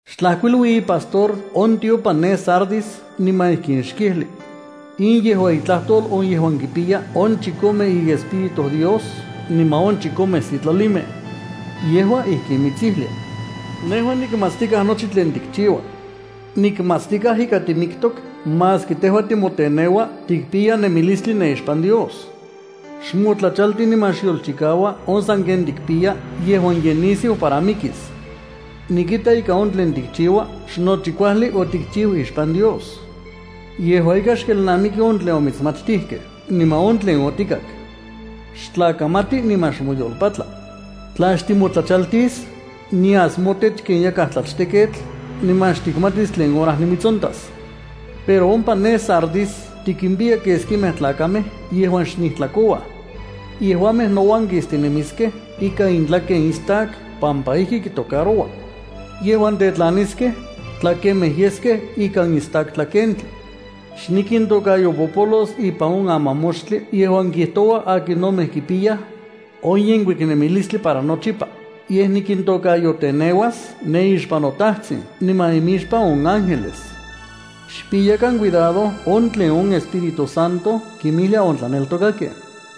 ’Xtlajkuilui ipastor on tiopan ne Sardis niman ijkin xkijli: “In yejua itlajtol on yejuan kipiya on chikome iEspíritus Dios niman on chikome sitlalimej. Yejua ijkin mitsijlia: Nejua nikmatstikaj nochi tlen tikchiua. Nikmatstikaj ika timiktok maski tejua timoteneua tikpiya nemilistli ne ixpan Dios. Xmotlachalti, niman xyolchikaua on tlen sanken tikpiya yejuan ye nisiu para mikis. Nikita ika on tlen tikchiua xnochi kuajli otikchiu ixpan Dios. Yejua ika, xkelnamiki on tlen omitsmachtijkej niman on tlen otikak. Xtlakamati, niman xmoyolpatla. Tla xtimotlachaltis, nias motech ken yakaj tlachteketl, niman xtikmatis tlen hora nimitsontas. Pero ompa ne Sardis tikimpiya keskimej tlakamej yejuan xnijtlakouaj. Yejuamej nouan kistinemiskej ikan intlaken istak pampa ijki kitocaroua. Yejuan tetlaniskej, tlakemejkej yeskej ikan istak tlakentli. Xnikintokayopopolos ipan on amamoxtli yejuan kijtoua akinomej kipiyaj on yenkuik nemilistli para nochipa, yej nikintokayoteneuas ne ixpan noTajtsin niman imixpan on ángeles. Xpiyakan cuidado on tlen on Espíritu Santo kinmijlia on tlaneltokakej.”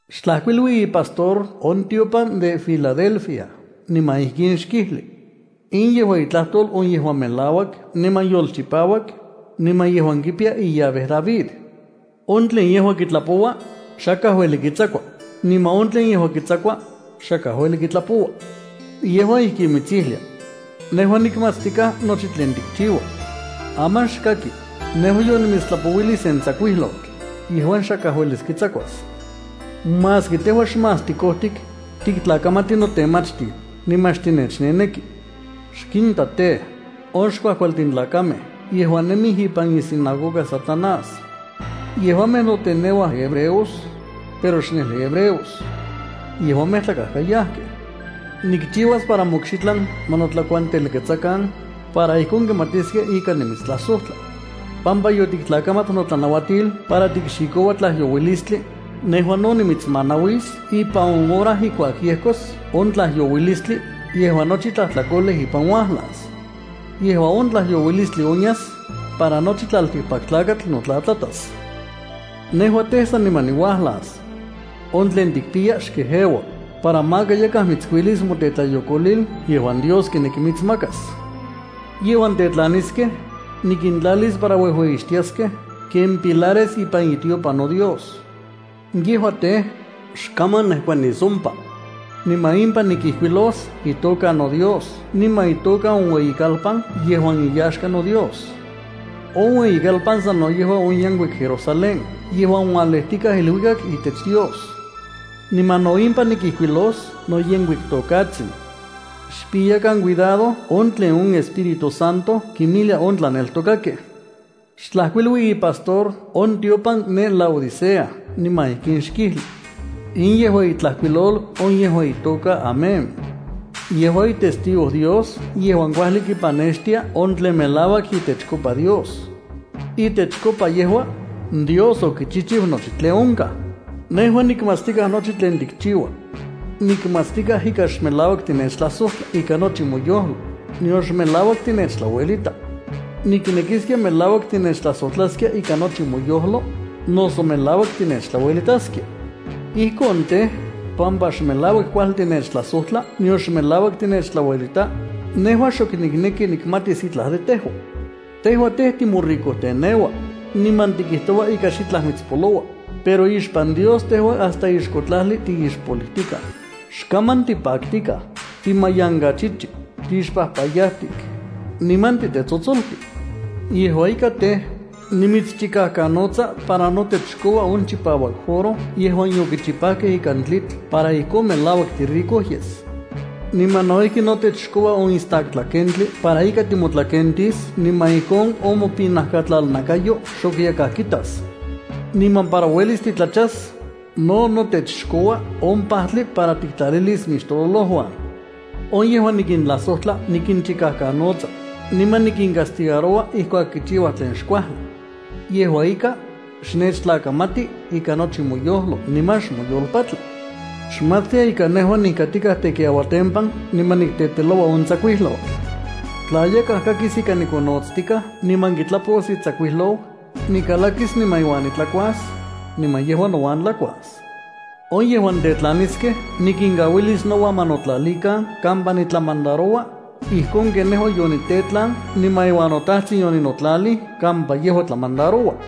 ’Xtlajkuilui ipastor on tiopan de Filadelfia niman ijkin xkijli: “In yejua itlajtol on yejuan melauak niman yolchipauak, niman yejuan kipiya illave David. On tlen yejua kitlapoua, xakaj ueli kitsakua; niman on tlen yejua kitsakua, xakaj ueli kitlapoua. Yejua ijkin mitsijlia: Nejua nikmatstikaj nochi tlen tikchiua. Aman xkaki, nejua yonimitstlapouilij sen tsakuijlotl yejuan xakaj uelis kitsakuas. Maski tejua xmás tikojtik, tiktlakamati notemachtil, niman xtinechneneki. Xkinta tej, on xkuajkualtin tlakamej yejuan nemij ipan isinagoga Satanás. Yejuamej noteneuaj hebreos, pero xnejli hebreos. Yejuamej tlakajkayajkej. Nikchiuas para mokxitlan ma notlakuantelketsakan, para ijkon kimatiskej ika nimitstlajsojtla. Pampa yotiktlakamat notlanauatil para tikxikoua tlajyouilistli, nejua no nimitsmanauis ipan on hora ijkuak yejkos on tlajyouilistli yejuan nochi tlajtlakolej ipan uajlas. Yejua on tlajyouilistli onyas, para nochi tlaltikpaktlakatl notlatlatas. Nejua tej, saniman niuajlas. On tlen tikpiya xkejeua, para maka yakaj mitskuilis motetlayokolil yejuan Dios kineki mitsmakas. Yejuan tetlaniskej, nikintlalis para uejueyixtiaskej ken pilares ipan itiopan noDios. Yejuamej tej, xkaman nejkuaniskej ompa. Niman impan nikijkuilos itoka noDios niman itoka on ueyikalpan yejuan iyaxka noDios. On ueyikalpan sano yejua on yenkuik Jerusalén yejuan ualejtikaj iluikak itech Dios. Niman no impan nikijkuilos noyenkuik tokatsin. Xpiyakan cuidado on tlen on Espíritu Santo kinmijlia on tlaneltokakej.” ’Xtlajkuilui ipastor on tiopan ne Laodicea niman ijkin xkijli: “In yejua itlajkuilol on yejuan itoka Amén. In yejua itestigo Dios yejuan kuajli kipanextia on tlen melauak itechkopa Dios. Itechkopa yejua, Dios okichijchiu nochi tlen onkaj. Nejua nikmatstikaj nochi tlen tikchiua. Nikmatstikaj ika xmelauak tinechtlajsojtla ikan nochi moyojlo, nion xmelauak tinechtlauelita. Ninekisia melauak tinechtlajsojtlaskia ikan nochi moyojlo, noso melauak tinechtlauelitaskia. Ijkon tej, pampa xmelauak kuajli tinechtlajsojtla nion xmelauak tinechtlauelita, nejua xok nikneki nikmatis itlaj de tejua. Tejua tej, timoricojteneua, niman tikijtoua ika xitlaj mitspoloua, pero ixpan Dios tejua hasta ixko tlajli tixpolijtikaj, xkaman tipaktikaj, timayankachichi, tixpajpayatik niman titetsotsoltik. Yejua ika tej, nimitschikajkanotsa para notech xkoua on chipauak oro yejuan yokichipajkej ika tlitl para ijkon melauak tirico yes. Niman no ijki notech xkoua on istak tlakentli para ika timotlakentis, niman ijkon on mopinajkatlalnakayo xok yakaj kitas. Niman para uelis titlachas, no notech xkoua on pajtli para tikintlalilis mixtololojuan. On yejuan nikintlajsojtla, nikinchikajkanotsa, niman nikincastigaroua ijkuak kichiuaj tlen xkuajli. Yejua ika, xnechtlakamati ikan nochi moyojlo niman xmoyolpatla. Xmatstia ika nejua nijkatikaj tekiauatempan, niman nikteteloua on tsakuijlotl. Tla yakaj kakis ika nikonotstikaj niman kitlapos itsakuijlou, nikalakis, niman iuan nitlakuas, niman yejua nouan tlakuas. On yejuan tetlaniskej, nikinkauilis nouan ma notlalikan kampa nitlamandaroua, ijkon ken nejua yonitetlan niman iuan noTajtsin yoninotlalij kampa yejua tlamandaroua.